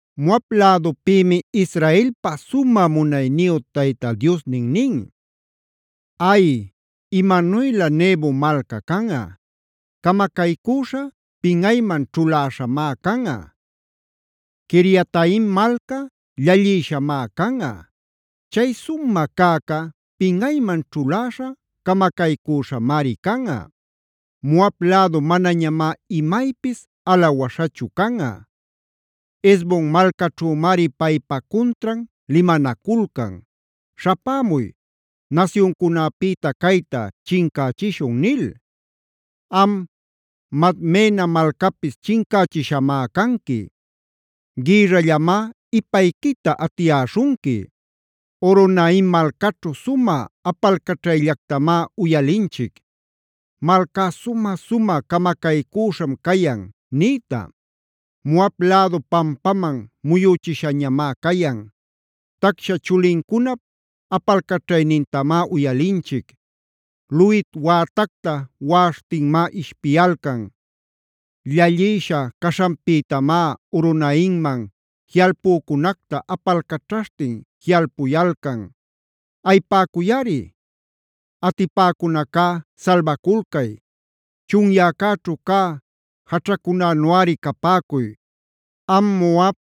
Moab lädupïmi Israelpa sumä munayniyu Tayta Diosnin nin: “Ay, imananuylä Nebo malca canꞌa; camacaycüśha, pinꞌayman ćhuläśhamá canꞌa. Quiriataim malca, llallïshamá canꞌa; chay sumä cäca pinꞌayman ćhuläśha, camacaycüśhamari canꞌa. Moab lädu manañamá imaypis alawaśhachu canꞌa. Hesbon malcaćhümari paypa cuntran limanaculcan: ‘Śhapämuy, nasyuncunäpïta cayta chincächishun’ nil. Am, Madmena malcapis chincächishamá canqui; gïrrallamá ipayquita atiyäśhunqui. Horonaim malcaćhu sumä apalcaćhayllactamá uyalinchic: ‘Malcá, sumä-sumä camacaycüśham cayan’ niyta. Moab lädu pampaman muyüchishañamá cayan. Tacsha chulincunap apalcaćhaynintamá uyalinchic. Luhit wätacta waꞌaśhtinmá ishpiyalcan. Llallïsha caśhanpïtamá Horonaimman jiꞌalpunacta apalcaćhaśhtin jiꞌalpuyalcan. Ayipäcuyꞌari; atipäcunacá salbaculcay. Chunyäcäćhu cä jaćhänuꞌari capäcuy. Am Moab,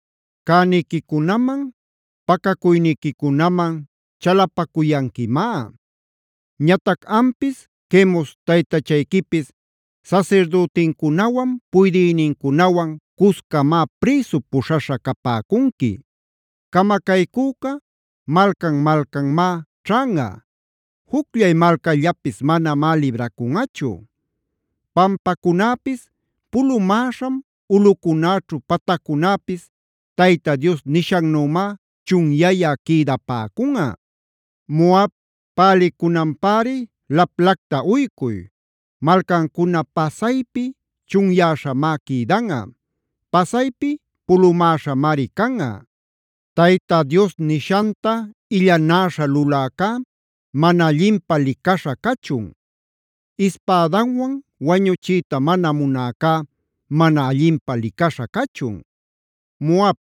cäniquicunaman, pacacuyniquicunaman chalapacuyanquimá. Ñatac ampis Quemos taytachayquipis sasirdütincunawan, puydïnincunawan cuscamá prïsu puśhaśha capäcunqui. “Camacaycüca malcan-malcanmá ćhanꞌa. Jucllay malcallapis manamá libracunꞌachu. Pampacunäpis pulumäśham ulꞌucunäćhu pataccunäpis Tayta Dios nishannümá chunyayä quïdapäcunꞌa. “Moab pälicunanpäri laplacta uycuy. Malcancuna pasaypi chunyäśhamá quïdanꞌa; pasaypi pulumäśhamari canꞌa. “Tayta Dios nishanta illanäśha luläcá, mana allinpä licaśha cachun. Ispädanwan wañuchiyta mana munäcá, mana allinpä licaśha cachun. “Moab,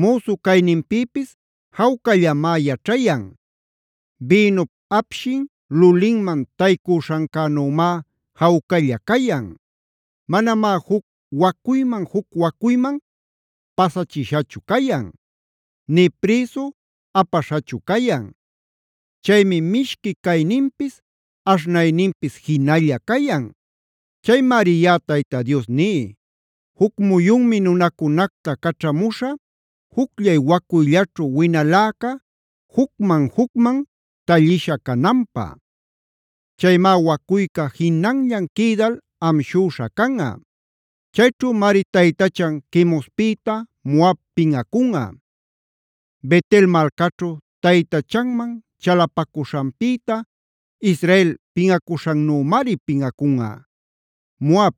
müsu cayninpïpis jawcallamá yaćhayan. Bïnup apshin lulinman taycüśhancänümá jawcalla cayan. Manamá juc wacuyman-juc wacuyman pasachishachu cayan; nï prïsu apaśhachu cayan. Chaymi mishqui cayninpis, aśhnayninpis jinalla cayan. “Chaymari yaꞌa Tayta Dios ní: Juc muyunmi nunacunacta caćhamuśhä, jucllay wacuyllaćhu winaläca jucman-jucman tallisha cananpä. Chaymá wacuyca jinanllan quïdal amshüśha canꞌa. Chayćhümari taytachan Quemospïta Moab pinꞌacunꞌa. Bet-el malcaćhu taytachanman chalapacuśhanpïta, Israel pinꞌacuśhannümari pinꞌacunꞌa. “Moab,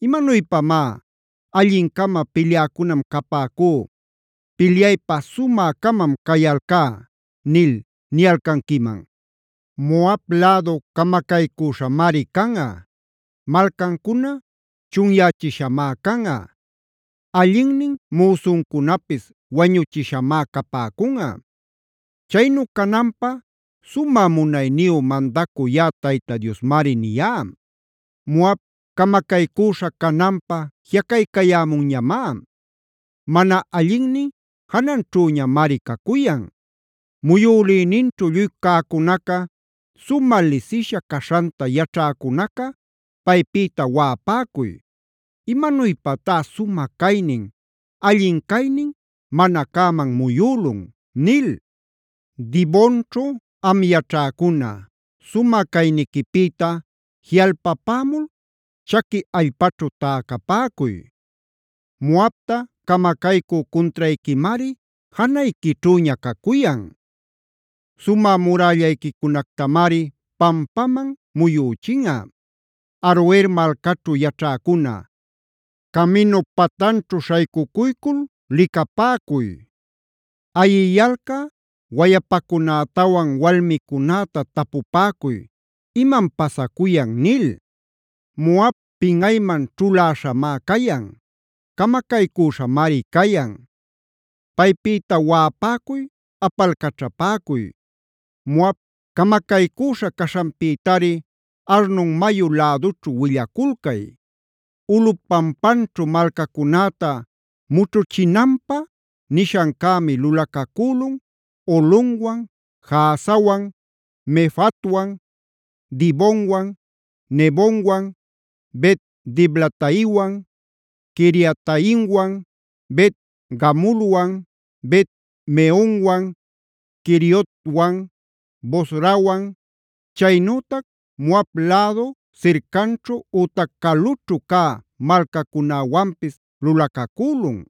¿imanuypamá: ‘Allin-cama pilyäcunam capäcú. Pilyaypä sumä-camam cayalcá’ nil niyalcanquiman? Moab lädu camacaycüśhamari canꞌa; malcancuna chunyächishamá canꞌa. Allinnin müsuncunapis wañuchishamá capäcunꞌa. Chaynu cananpä sumä munayniyu mandacü yaꞌa Tayta Diosmari niyá. Moab camacaycüśha cananpä jiꞌacaycayämunñamá. Mana allinnin jananćhüñamari cacuyan. Muyülïninćhu lluy cäcunaca, sumä lisisha caśhanta yaćhäcunaca paypïta waꞌapäcuy: ‘¿Imanuypatá sumä caynin, alli caynin mana cäman muyülun?’ nil. “Dibonćhu am yaćhäcuna, sumä cayniquipïta jiꞌalpapämul chaqui allpaćhu täcapäcuy. Moabta camacaycü cuntrayquimari janayquićhüña cacuyan; sumä murällayquicunactamari pampaman muyüchinꞌa. Aroer malcaćhu yaćhäcuna, caminup patanćhu śhaycucuycul licapäcuy. Ayiyalcä wayapacunätawan walmicunäta tapupäcuy: ‘¿Imam pasacuyan?’ nil. “Moab pinꞌayman ćhuläśhamá cayan; camacaycüśhamari cayan. Paypïta waꞌapäcuy, apalcaćhapäcuy. Moab camacaycüśha caśhanpïtari Arnon mayu lädućhu willaculcay. “Ulꞌup pampanćhu malcacunäta mućhuchinanpä nishancämi lulacacülun Holonwan, Jahazawan, Mefaatwan, Dibonwan, Nebowan, Bet-diblataimwan, Quiriataimwan, Bet-gamulwan, Bet-meonwan, Queriotwan, Bosrawan, chaynütac Moab lädu sircanćhu ütac calućhu cä malcacunäwanpis lulacacülun.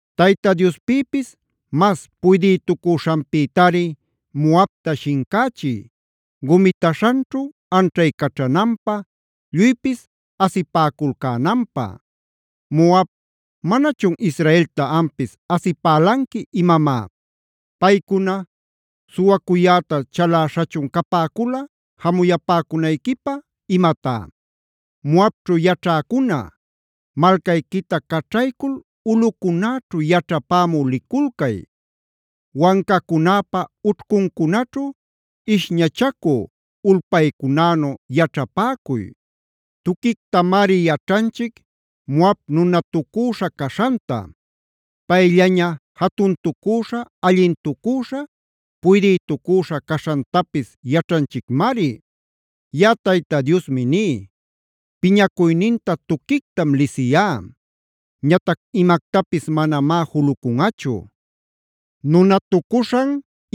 Tayta Diospïpis mas puydïtucuśhanpïtari Moabta shincächiy gumitaśhanćhu anćhaycaćhananpä, lluypis asipäculcänanpä. Moab, ¿manachun Israelta ampis asipälanqui imamá? ¿Paycuna suwacuyäta chalaśhachun capäcula jamuyapäcunayquipä imatá? “Moabćhu yaćhäcuna, malcayquita caćhaycul ulꞌucunäćhu yaćhapämü liculcay. Wancacunäpa ućhcuncunaćhu ishñachacü ulpaycunänu yaćhapäcuy. Tuquictamari yaćhanchic Moab nunatucüśha caśhanta. Payllaña jatuntacüśha, allintucüśha, puydïtucüśha caśhantapis yaćhanchicmari. Yaꞌa Tayta Diosmi ní: Piñacuyninta tuquictam lisiyá. Ñatac imactapis manamá julucunꞌachu. Nunatucuśhan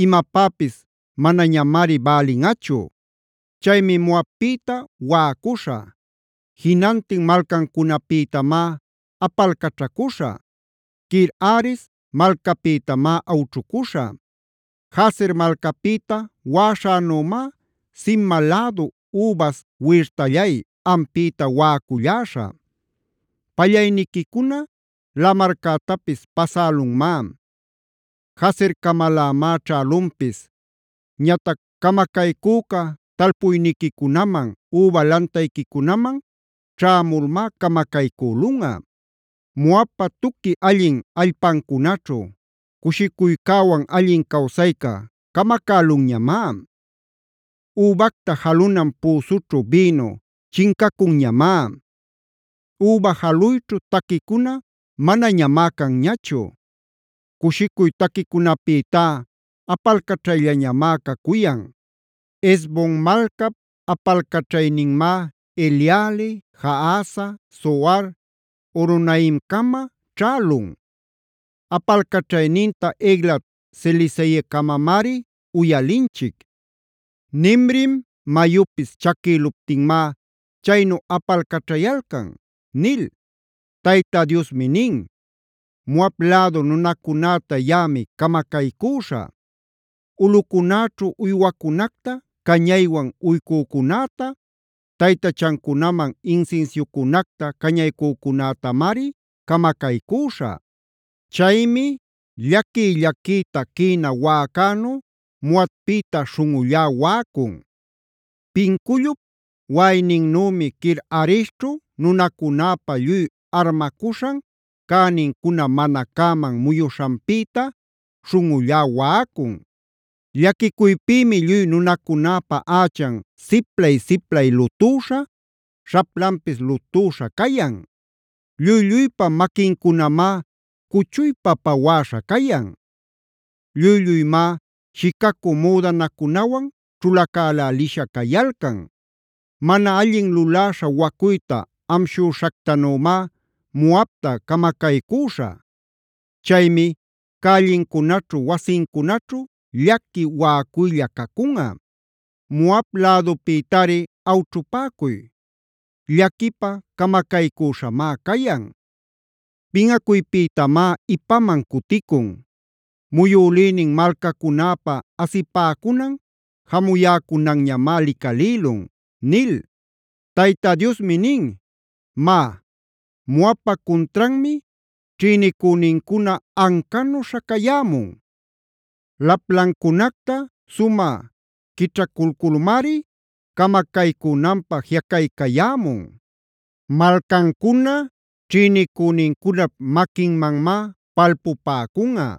imapäpis manañamari bälinꞌachu. Chaymi Moabpïta waꞌacuśhä. Jinantin malcancunapïtamá apalcaćhacuśhä. Kir-hares malcapïtamá awćhucuśhä. “Jazer malcapïta waꞌaśhänümá Sibma lädu übas wirtallay, ampïta waꞌaculläśhä. Pallayniquicuna lamarcätapis pasälunmá; Jazercamalämá ćhälunpis. Ñatac camacaycüca talpuyniquicunaman, üba lantayquicunaman ćhämulmá camacaycülunꞌa. Moabpa tuqui allin allpancunaćhu cushicuycäwan allin cawsayca camacälunñamá. Übacta jalunan püsućhu bïnu chincacunñamá; üba jaluyćhu taquicuna manañamá canñachu; cushicuy taquicunapïtá apalcaćhayñamá cacuyan. “Hesbon malcap apalcaćhayninmá Eleale, Jahaza, Zoar, Horonaimcama ćhälun; apalcaćhayninta Eglat-selisiyacamamari uyalinchic. Nimrim mayupis chaquïluptinmá chaynu apalcaćhayalcan” nil. Tayta Diosmi nin: “Moab lädu nunacunäta yaꞌami camacaycüśhä. Ulꞌucunäćhu uywacunacta cañaywan uycücunäta, taytachancunaman insinsiucunacta cañaycücunätamari camacaycüśhä. Chaymi llaquiy-llaquiyta quïna waꞌacänu Moabpïta śhunꞌullá waꞌacun. Pincullup waꞌayninnümi Kir-haresćhu nunacunäpa lluy armacuśhan cänincuna mana cäman muyuśhanpïta śhunꞌullá waꞌacun. Llaquicuypïmi lluy nunacunäpa ächan siplay-siplay lutüśha, śhaplanpis lutüśha cayan. Lluy-lluypa maquincunamá cuchuypa pawäśha cayan. Lluy-lluymá shicacü müdanacunawan ćhulacälälisha cayalcan. Mana allin luläśha wacuyta amshüśhactanümá Moabta camacaycüśhä. Chaymi cällincunaćhu wasincunaćhu llaqui waꞌacuylla cacunꞌa. Moab lädupïtari awćhupäcuy. Llaquipä camacaycüśhamá cayan. Pinꞌacuypïtamá ipaman cuticun. Muyülïnin malcacunäpa asipäcunan, jamuyäcunanñamá licalïlun” nil. Tayta Diosmi nin: “Má, Moabpa cuntranmi ćhïnicünincuna ancanu śhacayämun; laplancunacta sumä quićhaculculmari camacaycünanpä jiꞌacaycayämun. Malcancuna ćhïnicünincunap maquinmanmá palpupäcunꞌa.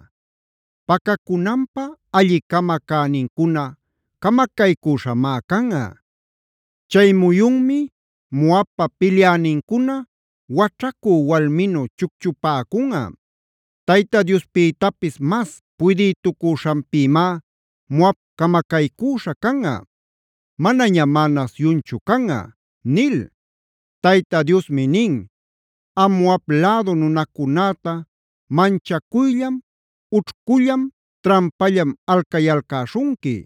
Pacacunanpä alli-cama cänincuna camacaycüśhamá canꞌa. Chay muyunmi Moabpa pilyänincuna waćhacü walminu chucchupäcunꞌa. Tayta Diospïtapis mas puydïtucuśhanpïmá Moab camacaycüśha canꞌa. Manañamá nasyunchu canꞌa” nil. Tayta Diosmi nin: “Am Moab lädu nunacunäta manchacuyllam, ućhcullam, trampallam alcayalcäśhunqui.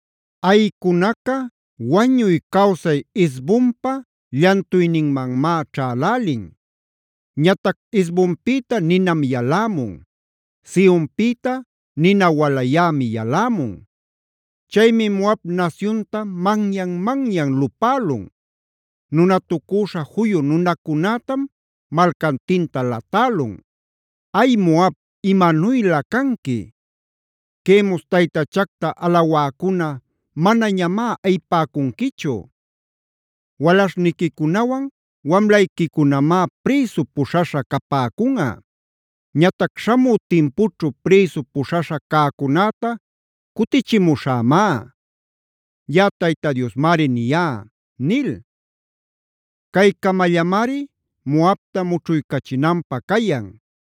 “Ayïcunaca wañuy-cawsay Hesbonpa llantuyninmanmá ćhälälin. Ñatac Hesbonpïta ninam yalämun; Sehonpïta nina walayämi yalämun; Chaymi Moab nasyunta manyan-manyan lupälun; nunatucüśha juyu nunacunätam malcantinta latälun. “¡Ay Moab, imanuylä canqui! ¡Quemos taytachacta alawäcuna manañamá ayipäcunquichu! Walaśhniquicunawan wamlayquicunamá prïsu puśhaśha capäcunꞌa. Ñatac śhamü timpućhu prïsu puśhaśha cäcunäta cutichimuśhämá. Yaꞌa Tayta Diosmari niyá” nil. Caycamallamari Moabta mućhuycachinanpä cayan.